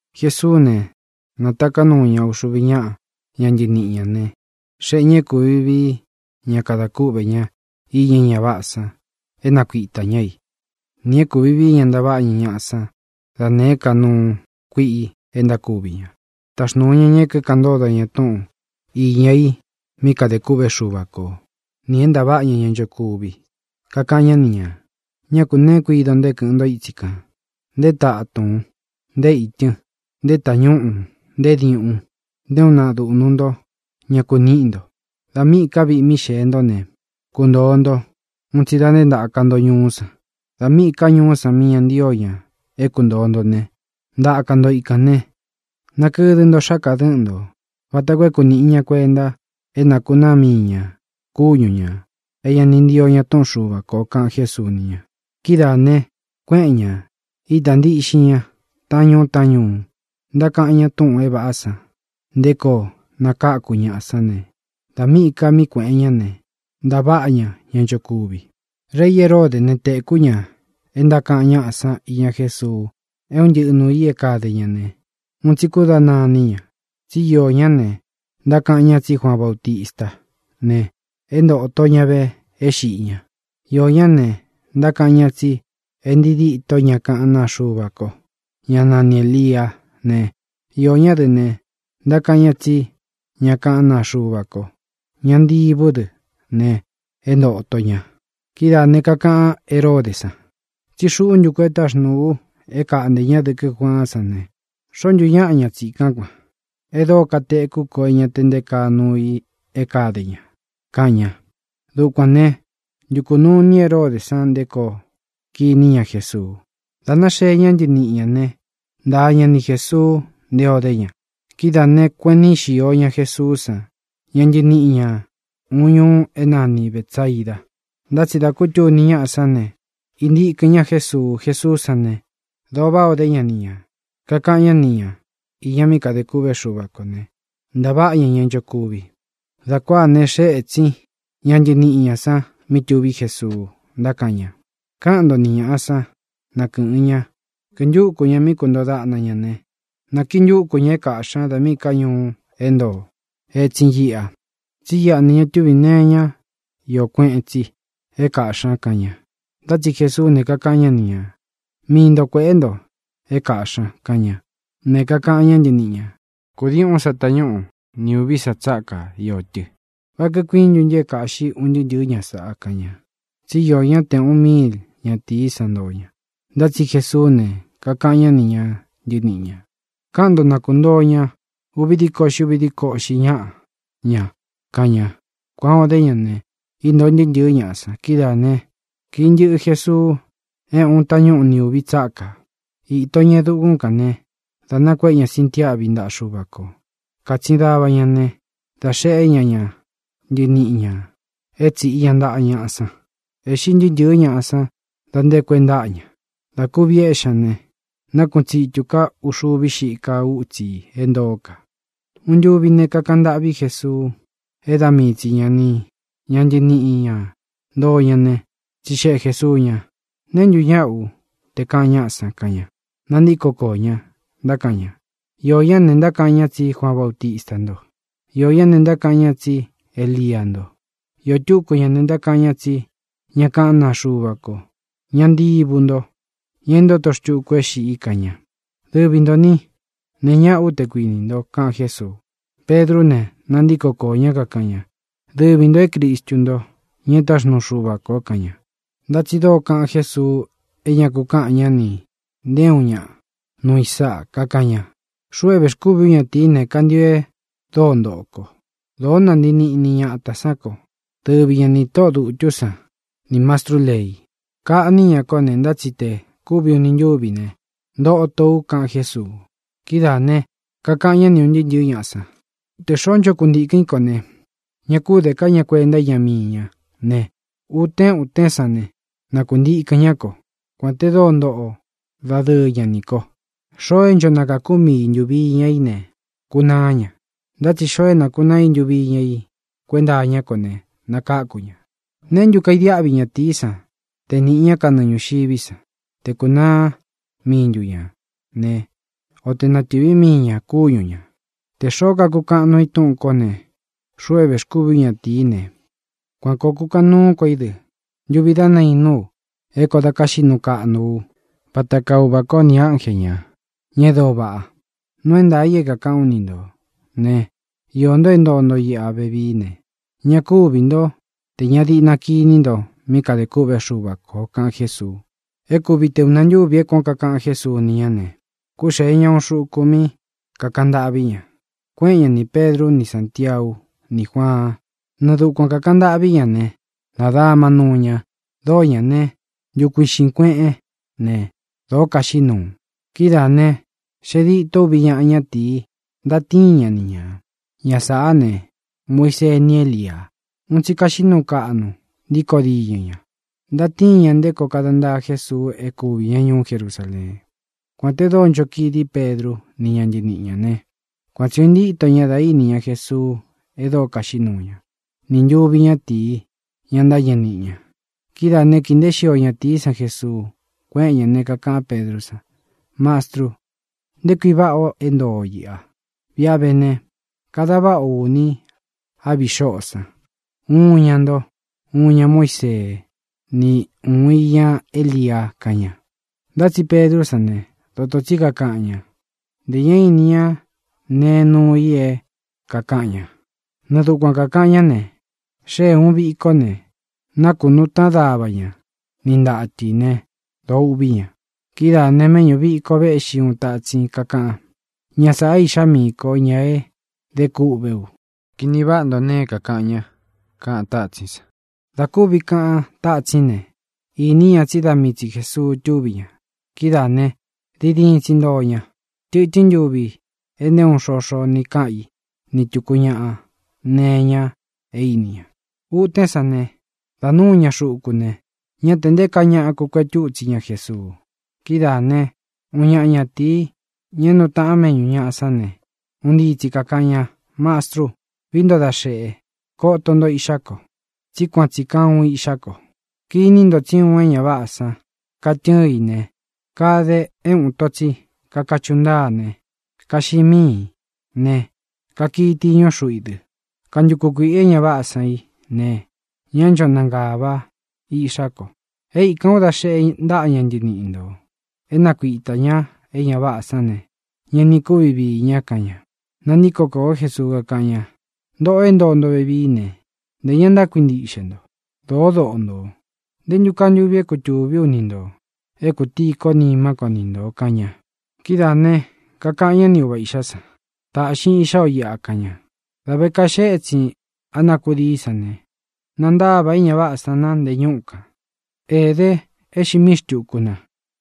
Jesuú ne, nātaká nuu ña uxuvi ñáꞌa ña ntɨniꞌi ñā ne, xéꞌe ñā é kūvi vií ña kada kúꞌvē ña iña é ña váꞌā san é nakuitā ñá i, nī é kūvi vií ña ntaváꞌa ña ñaꞌa san da nēé ka nuu kuíꞌi e ntákuvi ña. Taxnūu ña ña é kíkaꞌan ntódo ña túꞌūn iña i mí kadē kûꞌvé Xuva ko, nī é ntaváꞌa ña ña nchokuvi. Kakaꞌan ñá ni ñā: —Ñá kū neé kuido nto é kɨꞌɨn ntó itsi kān; nté tatūn, nté itɨn, nté tāñúꞌū, nté diuꞌun, nté uun naꞌa duꞌnu nto ña kuníꞌi nto. Dā míꞌī ká viꞌi mí xēe ntó ne, kuntōo nto un tsi da nté ntāka nto ñuú san. Dā míꞌī ká ñuú san mí ña ntío ña é kuntōo nto ne, ntaka nto ikān ne, nakɨdɨ nto xáka dɨ̄ꞌɨ́n nto vata koo é kunīꞌi ña kuenta é nakūnaá mii ñā kúñu ñā é ña ni ntío ña túꞌun Xuva kō —kaꞌan Jésuu ni ña. Kidáā ne, kuéꞌen ñā, ita ntíꞌxin ña taꞌán ñuu taꞌán ñuu, ntákaꞌan ña túꞌūn é vāꞌá san nté koo nakáku ñaꞌa san ne, dā míꞌī ka mí kuēꞌen ñá ne, ntaváꞌa ña ña nchokuvi. Rei Heródē né, tēkú ña e ntákaꞌan ñáꞌa san iña Jésuu é un ntɨꞌɨ nūu i é kade ña ne, un tsi kúdana iní ña, tsí iō ñá ne, ntákaꞌan ña tsí Juaan Bautistá ne, é ntōto ña ve é xiꞌi ña. Iō ñá ne, ntákaꞌan ñá tsi é ntii díto ña kaꞌán naa Xuva ko, ñá nani Ēliá ne, iō ñá dɨ ne, ntákaꞌan ñá tsí ña kaꞌán naa Xuva ko, ña ntivú dɨ ne, e ntóto ña. Kidáā ne, kakaꞌan Heródē san: —Tsí xuꞌu ntu ku é taxnūu u é kaꞌntē ñá dɨkɨ́ Juaán san ne, ¿xōo ntú ñaꞌa ña tsīkán kuān, e dóo katekú ko é ña te nté kaa nuu i é kade ña? —kaꞌan ña. Dukuān né, ntukū nuu ini Heródē san nté koo kiní ña Jesuu. Dā náxee ñá ntɨniꞌi ñā ne, ntaa ña ni Jēsuu nté o dé ña. Kidáā ne, kueꞌen níꞌi xio Jesuú san ña ntɨniꞌi ñā uun ñuu é nani Bētsaida. Ntá tsi dā kútuni ñáꞌā sán ne, íntikɨ̄n ñá Jesuu. Jesuú san ne, dōo váꞌā o dé ña ni ñā, kakaꞌan ñá ni ñā iña mí kadē kûꞌvé Xuva kō ne, ntaváꞌa ña ña nchokuvi. Dā kuáā ne, xée etsin ña ntɨniꞌi ñā san mí tuví Jesuu, ntákaꞌan ña: —Káꞌan nto ni ñāꞌa san, na kɨ́ꞌɨn ña, kintúku ña mí kuntoo daꞌna ña ne, na kintúku ñā é kaꞌxī ña da míꞌī ká ñuu é ntoo étsin iꞌa. Tsí iꞌa ne, ña túvī nee iñá iō kueꞌen tsi é kaꞌxī ña —kaꞌan ña. Ntá tsi Jesuú ne, kakaꞌan ñá ni ñā: —Mii nto kuēꞌé nto ña é kaꞌxī ña —kaꞌan ña. Ne, kakaꞌan ñá ntɨniꞌi ñā: —Kūdii uꞌún sa tañúꞌu ni ūví sa tsáka iō tɨ. ¿Vá kikuiín ntu ntɨ é kāꞌxí un ntɨɨ́ ntɨ̄ɨ́ ñaꞌa san? —kaꞌan ña. Tsí iō ñá te ūꞌun míil ñatīí san ntoo ña. Ntá tsi Jesuú ne, kakaꞌan ñá ni ña ntɨniꞌi ñā: —Káꞌan nto, na kuntōo ña uvi díko uꞌxi uvi díko uꞌxi ñáꞌa ña —kaꞌan ña. Kuan ō dé ña ne, íntōo ntɨɨ́ ntɨ̄ɨ́ ñaꞌa san. Kidáā né, kīꞌi ntɨꞌɨ Jesuu é ūꞌun tañúꞌu ni ūvi tsákā. Īto ña e dukún kān ne, dā nakuéꞌe ña sintiáꞌvi ntaꞌa Xuva kō. Kātsin dava ña ne, dā xeꞌé ña ña ntɨniꞌi ñā é tsīꞌi ña ntaꞌa ñaꞌa san. Ēꞌxi ntɨɨ́ ntɨ̄ɨ́ ñaꞌa san da nté ku e ntáꞌa ña. Dā kúvi éꞌxi ña ne, nákuꞌun tsitū ká uxuvi xiká utsi i é ntoó ka. Uun ntuvi ne, kakaꞌan ntâꞌví Jesuu é da mii tsi ña ni ña ntɨniꞌi ñā ntoo ña ne, tsixeꞌe Jēsuu ña: —¿Neē ntú ñaꞌa ú, tē kaꞌan ñáꞌa san? —kaꞌan ña. Nantíko koō ñá, ntákaꞌan ña: —Iō ñá ne, ntákaꞌan ña tsí Juaan Bautista nto. Iō ñá ne, ntákaꞌan ña tsí Elia nto. Iō túku ña ne, ntákaꞌan ña tsí ña kaꞌán naa Xuva ko, ña ntivu ntó, ña e ntóto xtuku é xiꞌi —kaꞌan ña. —Dɨvi ntō ní, ¿neé ñaꞌa ú, te kuinī nto? —kaꞌan Jésuu. Pedrú ne, nantíko koō ñá, kakaꞌan ña: —Dɨvi ntō é Cristu nto, ña e táxnuu Xuva kō —kaꞌan ña. Ntá tsi dóo kaꞌan Jésuu é ña ku kaꞌán ña nī nté uun ñaꞌa nuu i sáꞌa. Kakaꞌan ña: —Xuꞌu é vēxkúvi ú ñatīí ne, kantio e dóo ntoꞌo ko. Dōó nantii niꞌni ñatā sán ko, dɨvi ña nī tóꞌō dutú san nī mastrú lei. Kaꞌní ña kó ne, ntá tsi tē kúvi uni ntúvi ne, ntoto u —kaꞌan Jésuu. Kidáā ne, kakaꞌan ñá ni ūn ntɨɨ́ ntɨ̄ɨ́ ñaꞌa san: —Tē xoó ncho kuntīkɨ́n i kó ne, ña kú de ká ña kuenta íña mii ña ne, utén utén san ne, na kuntikɨ̄n ñá ko, kuān te dóo ntoꞌo dadɨɨ ña nī ko. Xoo é ncho nakakū mii i ntuvi iña í ne, kunaá ña. Ntá tsi tē xoo nakunaá i ntuvi iña í kuenta iñá ko ne, nakáku ña. ¿Neé ntu kaidiáꞌvi ñatīí san te nīꞌi ñá kanɨɨ ñūxiví san, te kūnaá mii ntu ñā ne, o tē natɨ́vi mii ñā kúñu ñā? Tē xoó kakukaꞌan nuu i túꞌūn kó ne, xuꞌu é vēxkúvi ú ñatīí ne, kuan kōo kukaꞌan nuú ko í dɨ ntuvi dá nainú u é koó dā káxiꞌi nuu kaꞌnú u vata kaa Uvā kó nī ánje ñā, ña e dóo vaꞌa. Nuu é ntaā i é kāꞌán u ni nto ne, iō nto é ntoo nto iꞌa vevií ne, ña kúvī ntó tē ña diꞌna kiní nto míꞌi kadē kûꞌvé Xuva kō —kaꞌan Jésuu. E kúvi te ūna ntúvī é kuān ó kakaꞌan Jésuu ni ñá ne, kúxēe ña uun xuku mí kūkaꞌan ntâꞌví ña. Kuéꞌen ña nī Pedru ni Sántiau ní Juaan. Nɨɨ dukuan kākaꞌan ntâꞌví ña ne, nādama nuu ña. Dóo ñā né, ntukuiꞌxīn kueꞌén ne, dōo kaxiꞌí nuu. Kidáā ne, xee dîtó uvi ñaꞌa ñátīi, ntatíin ña ni ñā. Ña sāꞌá ne, Muisee ni Élia. Un tsi kaxiꞌí nuu kaꞌnu ntīkó diñɨ ña. Ntatíin ña nté koo kada ntaa Jésuu é kuvī ñá ñuú Jerusaleen. Kuān te dóo ncho kidí Pedru ni ña ntɨníꞌi ña ne, kuan tsī ó intíto ña da íni ña Jesuu e dóo kaxiꞌí nuu ña, nī ntuvi ñátīi, ña ntâñɨ niꞌi ña. Kidáā né, kīi nteé xio ñatīí san Jesuu, kuéꞌen ñā ne, kakaꞌán Pedrú san: —Mastru, ¡nté kui váꞌa ō é ntoo o īꞌa! Viꞌi a vé ne, kada váꞌa ō uni á viꞌi xóꞌō san, uun iña nto, uun iña Muísee, ni uun iña Élia —kaꞌan ña. Ntá tsi Pedrú san ne, dotō tsí kakaꞌan ña; ntē ña íni ña ne nuu i é kākaꞌan ña. Nɨɨ dukuan kākaꞌan ñá ne, xée uun vīkó ne, nākunuu táꞌan dava ña ni ntatɨ ī né, dōo uꞌví ña. Kidáā ne, méꞌñū viko véꞌxi uun tātsín, kakaꞌan: —Ña sāꞌa é Iꞌxá miī kó, ña e dé kûꞌvé u. Kini váꞌa nto nee é kākaꞌan ña —kaꞌan tátsín san. Dā kúvi kaꞌan tátsín ne, īní ña tsí da mii tsi Jēsuu tuví ña. Kidáā ne, diin diin tsi ntoo ña. Tɨtɨ́n ntuvi e nté uun xoxo ni káꞌan í ni tūku ñaꞌa nee iña é īni ña. Utén san ne, dā núu ña xuku ne, ñá tē nté kaa ñaꞌa kukuetú itsi ña Jesuu. Kidáā né, uun ñaꞌa ñatīí, ña é nuu taꞌan méꞌñū ñaꞌa sán ne, un ntii tsi kākaꞌan ña: —Mastru, vií nto da xeꞌe, koto nto iꞌxá ko, tsí kuan tsī kaa uun iꞌxá ko. Kiní nto tsí uun é ña váꞌā san katɨ́ɨn i ne, kade é uun ito tsi kakachuꞌu ntáa ne, kaxiꞌi míī ne, kakii tiñu xúꞌu i dɨ. Kantuku kuīꞌi é ña váꞌā san i ne, ñá ncho nangāvá iꞌxá ko. E íkān ú da xeꞌe ntaꞌa ña ntɨniꞌi ntō é nakuitā ña é ña váꞌā san ne, ña ni kúvi viī ña —kaꞌan ña. Nantíko kōó Jesuu, kakáꞌan ña: —¡Ntoꞌō é ntoo nto vevií ne, ntē ña ntákuintiꞌxe nto! ¡Dōó doꞌo nto! ¿Nté ntu kaa ntuvi é kutūví u ni ntō, é kūtíī kó nimá ko ni ntō? —kaꞌan ña. Kidáā ne, kakaꞌan ñá ni uva īꞌxá san: —Taꞌxin iꞌxá o iꞌa —kaꞌan ña. Dā vé kaxee étsīn á na kudií san ne, nantáva é ña váꞌā san na nte ñúꞌu kān. Ēde e xiꞌi míi xtūku na.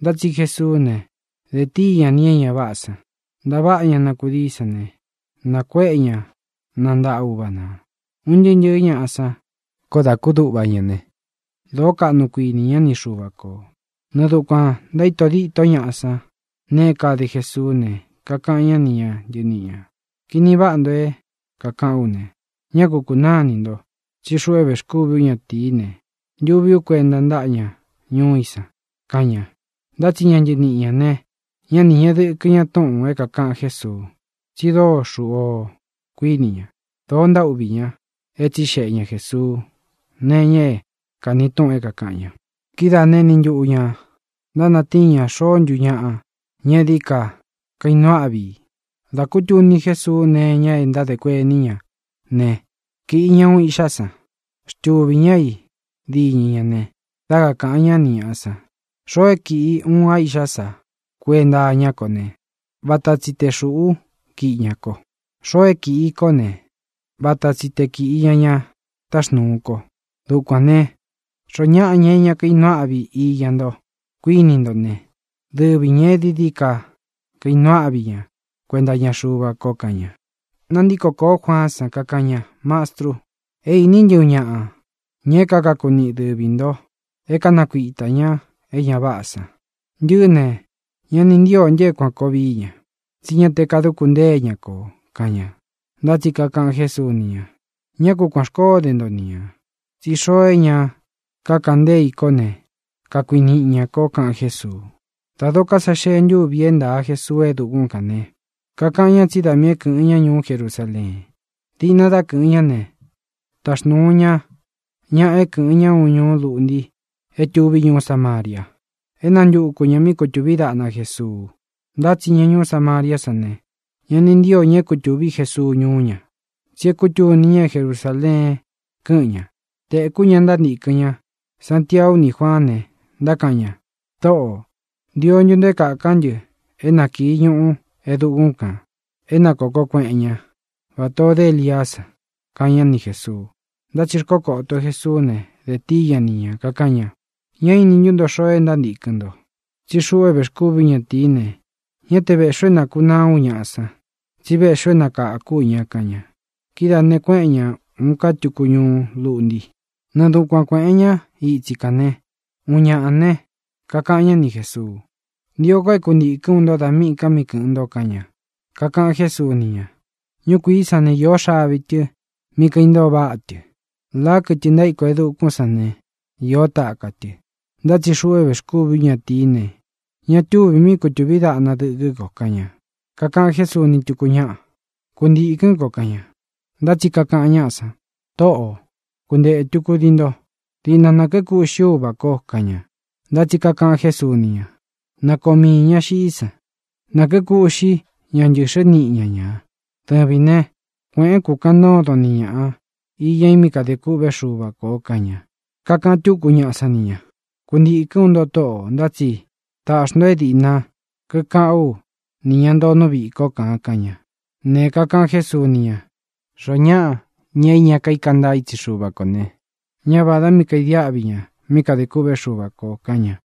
Ntá tsi Jesuú ne, dē tíi ña nī é ña váꞌā san. Ntāváꞌa ña na kudií san ne, nakuéꞌe ña na ntaꞌa uva nā. Un ntɨɨ́ ntɨ̄ɨ́ ñaꞌa san koó dā kúduꞌva ña ne, dōó kaꞌnu kuíni ña ni Xuva kō. Nɨɨ dukuān ntaíto díto ñaꞌa san nēe é kade Jesuú ne, kakaꞌan ñá ni ña ntɨniꞌi ñā: —Kini váꞌa nto é kākaꞌán u ne, ñá ku kūnáa inī nto; tsí xuꞌu é vēxkúvī ú ñatīí ne, ntuví u kuenta ntáꞌa ña ñuú i san —kaꞌan ña. Ntá tsi ña ntɨniꞌi ñā ne, ñá ni ñēꞌe dɨkɨ ña túꞌūn é kākaꞌan Jésuu, tsi dóo xūꞌú o, kuiní ña. Dōo ntaúꞌvī ña é tsixeꞌe ña Jēsuu nee iña é kāni túꞌun é kākaꞌan ña. Kidáā né, eni ntuꞌu ñā ntánatíin ña xoó ntu ñaꞌa ña é dií ka kainuu áꞌvi i. Dā kútuni Jésuu nee iña é ntádē kuení ña ne, kīꞌi ña uun iꞌxá san, xtuvī ñá i díñɨ ñā ne, dá kakāꞌan ñá ni ñāꞌa san: —Xoo é kiꞌi i uun a iꞌxá sa kuenta iñá ko ne, vata tsi te xūꞌú kiꞌi ña ko. Xoo é kīꞌi i kó ne, vata tsi te kīꞌi ña ña táxnūu ko. Dukuān ne, xoó ñaꞌa, ña é ña kainuu áꞌvi iña nto, kuinī ntó ne, dɨvi ñā e dií dií ka kainuu áꞌvi ña kuenta iña Xuva ko —kaꞌan ña. Nantíko kōó Juaán san, kakaꞌan ña: —Mastru, é īní ntɨ uun ñaꞌa, ña é kakaku niꞌi dɨvī nto é kanakuita ñā é ña váꞌā san. Ntɨꞌɨ́ ne, ña ni ntíō ntɨ é kuān koo vií ña, tsí ña te kaduku ntée ña kō —kaꞌan ña. Ntá tsi kakaꞌan Jésuu ni ña: —Ñá ku kuān xkoó de nto ni ñā, tsi xoo é ña kakaꞌan ntée i kō ne, kakuiniꞌi ña kō —kaꞌan Jésuu. Dā dokó sa xee ntúvi é ntāa Jesuu e dukún kān ne, kakaꞌan ña tsí da miī é kɨ̄ꞌɨn ñá ñuú Jerusaleen. Diꞌna dá kɨꞌɨn ñá ne, taxnūu ña ñaꞌa é kɨ̄ꞌɨn ñá uun ñuú luꞌnti é tuví ñuú Samaria, é nantuku ñā míꞌi kutūví daꞌna Jesuu. Ntá tsi ña ñuú Samariá san ne, ña ni ntío ñā é kutūví Jesuu ñuú ña, tsi é kūtuni ña é Jerusaleen kɨ́ꞌɨn ñā. Tēkú ña ntántīkɨn ñá, Santiau ní Juaán ne, ntákaꞌan ña: —Tōꞌó, ¿ntio ntu nto é kākán ntɨ é na kīi ñuꞌu e dukún kān é na kōko kueꞌen ñá, vatā o dé Eliá san? —kaꞌan ñá ni Jēsuu. Ntá tsi xkókōó Jesuú ne, dē tíi ña ni ñā, kakaꞌan ña: —¿Ña íni ntú nto xoo é ntántīkɨn nto? Tsí xuꞌu é vēxkúvi ú ñatīí ne, ñá te vēꞌxí u é nākunaá u ñaꞌa san, tsí véꞌxī u é nakākú u ña —kaꞌan ña. Kidáā ne, kuéꞌen ña ūun ka túku ñuú luꞌnti. Nɨɨ dukuan kuēꞌen ñá itsi kān ne, uun ñaꞌa ne, kakaꞌan ñá ni Jēsuu: —Ntio ko é kuntīkɨ́n u nto dā míꞌī ka mí kɨꞌɨ̄n nto —kaꞌan ña. Kakaꞌan Jésuu ni ña: —Ñúkuīí san ne, iō xavi tɨ mí kaintoo váꞌa tɨ. Lāá, kɨtɨ ntaíko e dukún san ne, iō taka tɨ. Ntá tsi xuꞌu é vēxkúvi ú ñatīí ne, ña túvī míꞌi kutūví daꞌna dɨkɨ́ ko —kaꞌan ña. Kakaꞌan Jésuu ni túku ñáꞌa: —Kuntīkɨ́n ko —kaꞌan ña. Ntá tsi kakaꞌan ñáꞌa san: —Tōꞌó, kuntētu kudii nto. Diꞌna nā kíkuꞌxí u uvā kó —kaꞌan ña. Ntá tsi kakaꞌan Jésuu ni ña: —Na koo miī ña xiꞌí san. Nā kíkuꞌxí ña ntɨ̄xɨ́ niꞌi ña ñā. Dɨvīn né, kuēꞌén kūkaꞌan ntódon ni ñāꞌa iña i mí kadē kûꞌvé Xuva kō —kaꞌan ña. Kakaꞌan túku ñaꞌa sán ni ñā: —Kuntīkɨ́n u nto, Tóꞌō. Ntá tsi tāꞌxi nto é dīꞌna kíkaꞌán u nī ña ntoo nú viꞌī kó kān —kaꞌan ña. Ne, kakaꞌan Jésuu ni ña: —Xoó ñaꞌa, ña é ña kaíka ntaa itsi Xúva kō ne, ñá vādá mí kaidiáꞌvi ña mí kadē kûꞌvé Xuva kō —kaꞌan ña.